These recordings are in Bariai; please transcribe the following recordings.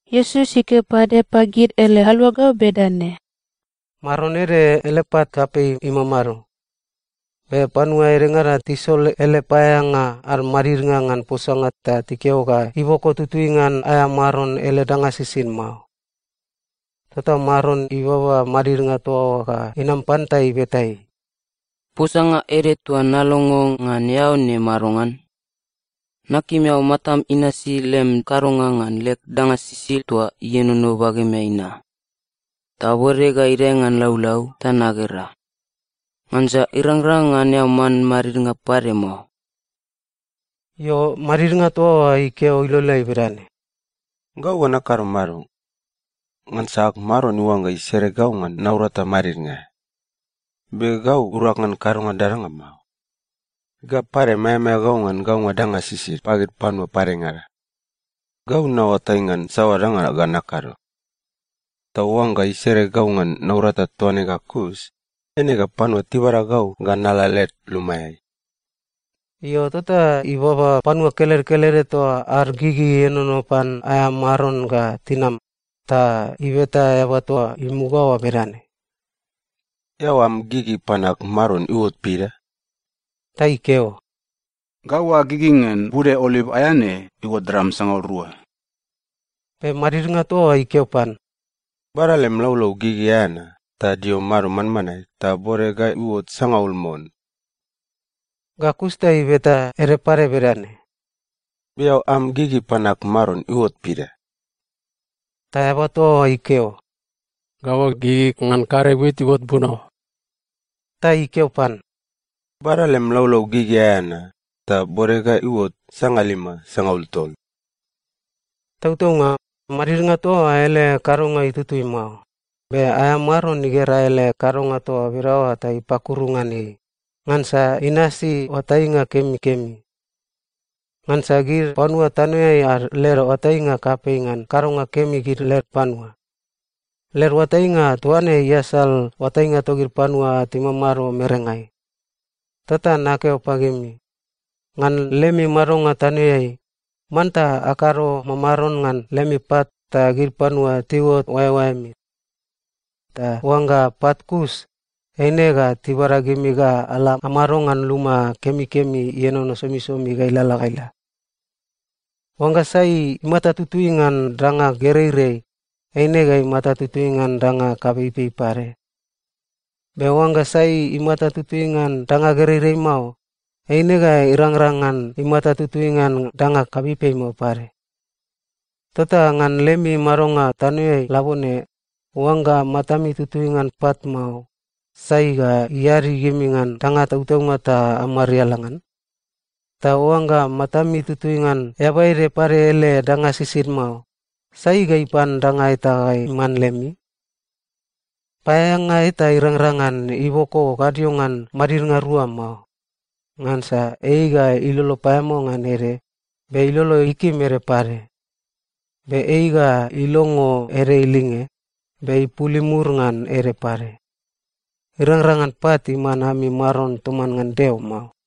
Iesus ikeo pade pagid ele aluagau bedane, “Maron ede ele pat kapei imamado. Be panua edengada tisol ele paeaeanga ad madidnga ngan posanga ta tikeo ga iboko tutui ngan aea maron ele danga sisid mao. Tota maron ibaba madidnga toa oa ga inam pan ta ibeta ei, ‘Posanga ede toa nalongo ngan eao ne madongan? Nakim eao matam inasi lem kadonga ngan leg danga sisid toa ienono bagemeai na, ta bode ga idae ngan laulau ta nagera. Ngansa irangrang ngan eao man madidnga pade mao.’ “Io, madidnga toa oa ikeo iloleai bedane, ‘Gau ga nakado mado? Ngansa ag maron iuangga isere gau ngan naurata madidnga aea. Be gau urag ngan kadonga dadanga mao. Ga pade, maeamaea gau ngan gaunga danga sisid pagid panua padengada. Gau naoatai ngan saoa danga ga nakado. Ta oangga isere gau ngan naurata toa ne ga kus, eine ga panua tibada gau ga nala led lumaeai.’ “Io, tota ibaba panua kelede kelede toa ad gigi ienono pan aea maron ga tinam, ta ibeta eaba toa imuga oa bedane, ‘Eao am gigi pan ag maron iuot pida?’ “Ta ikeo, ‘Gau ag gigi ngan bude oliv aea ne iuot dram sangaul rua.’ “Be madidnga toa oa ikeo pan, ‘Bada lem laulau gigi aea na, ta dio mado manmanae ta bode ga iuot sangaul mon.’ “Ga kus ta ibeta ede pade bedane, ‘Be eao am gigi pan ag maron iuot pida?’ “Ta eaba toa oa ikeo, ‘Gau ag gigi ngan karei wit iuot buno.’ “Ta ikeo pan, ‘Bada lem laulau gigi aea na, ta bode ga iuot sangalima sangaul tol.’ “Tautaunga, madidnga toa oa ele kadonga itutui mao, be aea maron igera ele kadonga toa bedaoa ta ipakuru ngan ei, ngansa inasi oatainga kemikemi. Ngansa gid panua tanoeai ad led oatainga kapei ngan kadonga kemi gid led panua. Led oatainga toa ne iasal oatainga togid panua timamado merengai. Tota nakeo pagimi, ngan lemi madonga tanoeai, manta akado mamaron ngan lemi pat ta gid panua tiuot oaeoaemi. Ta oangga pat kus, eine ga tibada gimi ga ala amado ngan luma kemikemi ienono somisomi ga ilalala ga ila. “Oangga sai imata tutui ngan danga gereirei, eine ga imata tutui ngan danga kapeipei pade. Be oangga sai imata tutui ngan danga gereirei mao, eine ga irangrang ngan imata tutui ngan danga kapeipei mao pade. Tota ngan lemi madonga tanoeai labone, oangga matami tutui ngan pat mao, sai ga iadi gimi ngan danga tautaunga ta amariala ngan? Ta oangga matami tutui ngan eaba ede pade ele danga sisid mao, sai ga ipan danga eta ga iman lemi? “Paeaeanga eta irangrang ngan iboko gadio ngan madidnga rua mao. Ngansa ei ga ilolo paeamao ngan ede, be ilolo ikim ede pade. Be ei ga ilongo ede ilinge, be ipul imur ngan ede pade. Irangrang ngan pat iman ami maron toman ngan Deo mao.”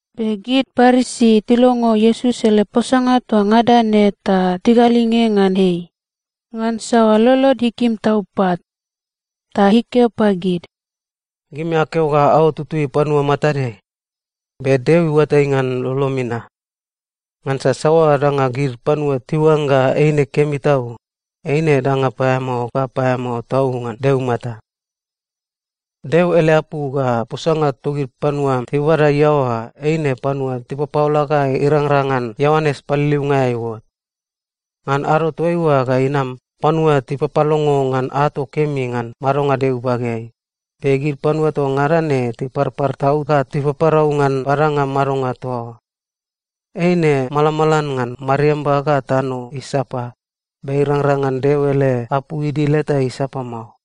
Be gid Parisi tilongo Iesus ele posanga toa ngada ne ta tigalinge ngan ei, ngansa lolod ikim tau pat. Ta ikeo pagid, “Gimi akeo ga aot tutui panua matadeai, be Deo iuatai ngan lolomi na. Ngansa saoa danga gid panua tiuangga eine kemi tau, eine danga paeamao ga paeamao tau ngan Deo imata. “Deo ele apu ga posanga togid panua tibabada iaoa eine panua tipapaola ga irangrang ngan Ioanes Paliliunga aea iuot. Ngan ado toaiua ga inam, panua tipapalongo ngan ato kemi ngan madonga Deo ibageai, be gid panua toa ngada ne tiparpar tau ga tipaparau ngan badanga madonga toa oa. Eine malamalan ngan mariamba ga tano isapa, be irangrang ngan Deo ele apu idil eta isapa mao.”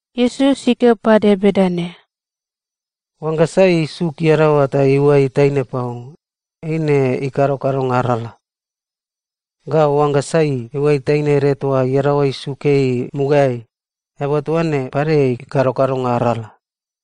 Iesus ikeo pade bedane, “Oangga sai isuk iadaoa ta iuai taine pau, eine ikado kadonga arala. Ga oangga sai iuai taine ede toa iadaoa isuk ei mugaeai, eaba toa ne pade ikado kadonga arala.”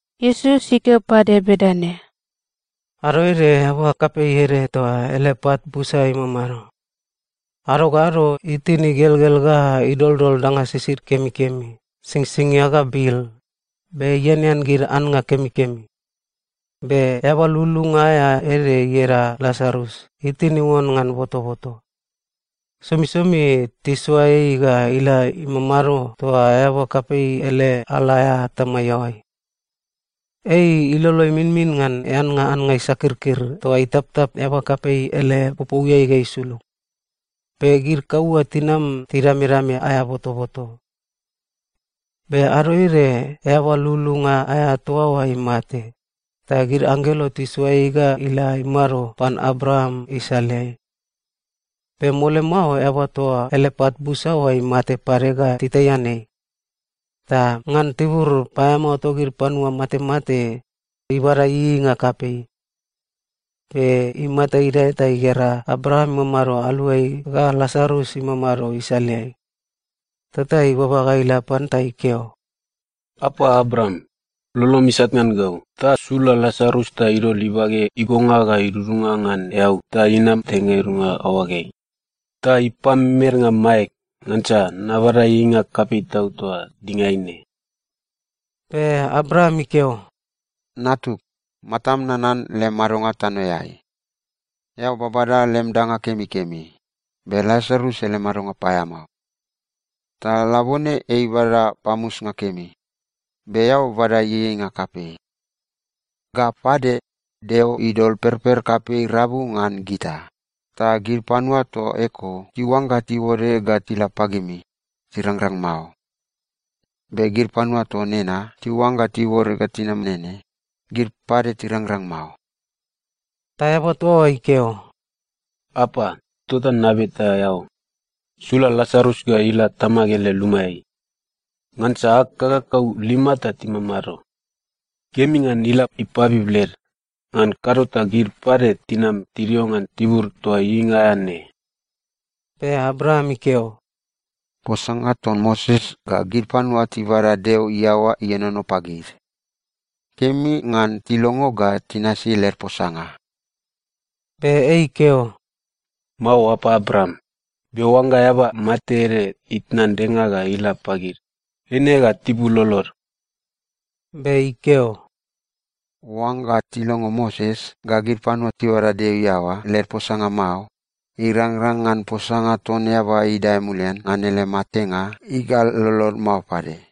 Iesus ikeo pade bedane, “Ado ede eaba kapei ede toa ele pat busa imamado. Ado ga ado itin igelgel ga idoldol danga sisid kemikemi, singsingia ga bil, be ianean gid annga kemikemi. Be eaba lululunga aea ede ieda Lasarus itin iuon ngan botoboto. Somisomi tisoa ei ga ila imamado toa eaba kapei ele ala aea atama iaoai. Ei ilolo iminmin ngan eannga annga isakirkir toa itaptap eaba kapei ele popouiai ga isulug. Be gid kaua tinam tidamedame aea botoboto. “Be ado ede eaba lululunga aea toa oa imate, ta gid anggelo tisoa ei ga ila imado pan Abraam isaleai. Be mole mao eaba toa ele pat busa oa imate pade ga titaian ei. Ta ngan tibur paeamao togid panua matemate, ibada ieieinga kapei. Be imata idae ta igera Abraam imamado aluai ga Lasarus imamado isaleai. Tota ibaba ga ila pan ta ikeo, ‘Apa Abraam, lolom isat ngan gau ta sula Lasarus ta idol ibage igonga ga idudunga ngan eau ta inam teng ga idudunga aoageai, ta ipamemednga maeg, ngansa nabada ieieinga kapei tau toa dingaeai ne.’ “Be Abraam ikeo, ‘Natug, matam nanan lem madonga tanoeai. Eao babada lem danga kemikemi, be Lasarus ele madonga paeamao. Ta labone ei ibada pamusnga kemi, be eao bada ieieinga kapei. Ga pade, Deo idol perper kapei rabu ngan gita, ta gid panua toa eko tiuangga tiuore ga tila pagimi, tirangrang mao. Be gid panua toa nena tiuangga tiuore ga tinam nene, gid pade tirangrang mao.’ “Ta eaba toa oa ikeo, ‘Apa, tota nabeta eao, sula Lasarus ga ila tamag ele lumaeai. Ngansa ag kakakau lima ta timamado. Kemi ngan ila ipabib led, ngan kado ta gid pade tinam tidio ngan tibur toa ieieinga aea ne.’ “Be Abraam ikeo, ‘Posanga ton Moses ga gid panua tibada Deo iaoa ienono pagid. Kemi ngan tilongo ga tinasi led posanga.’ “Be ei ikeo, ‘Mao, apa Abraam, be oangga eaba mate ede itnan denga ga ila pagid, eine ga tipul lolod.’ “Be ikeo, ‘Oangga tilongo Moses ga gid panua tibada Deo iaoa led posanga mao, irangrang ngan posanga ton eaba idae mulian ngan ele matenga igal lolod mao pade.’”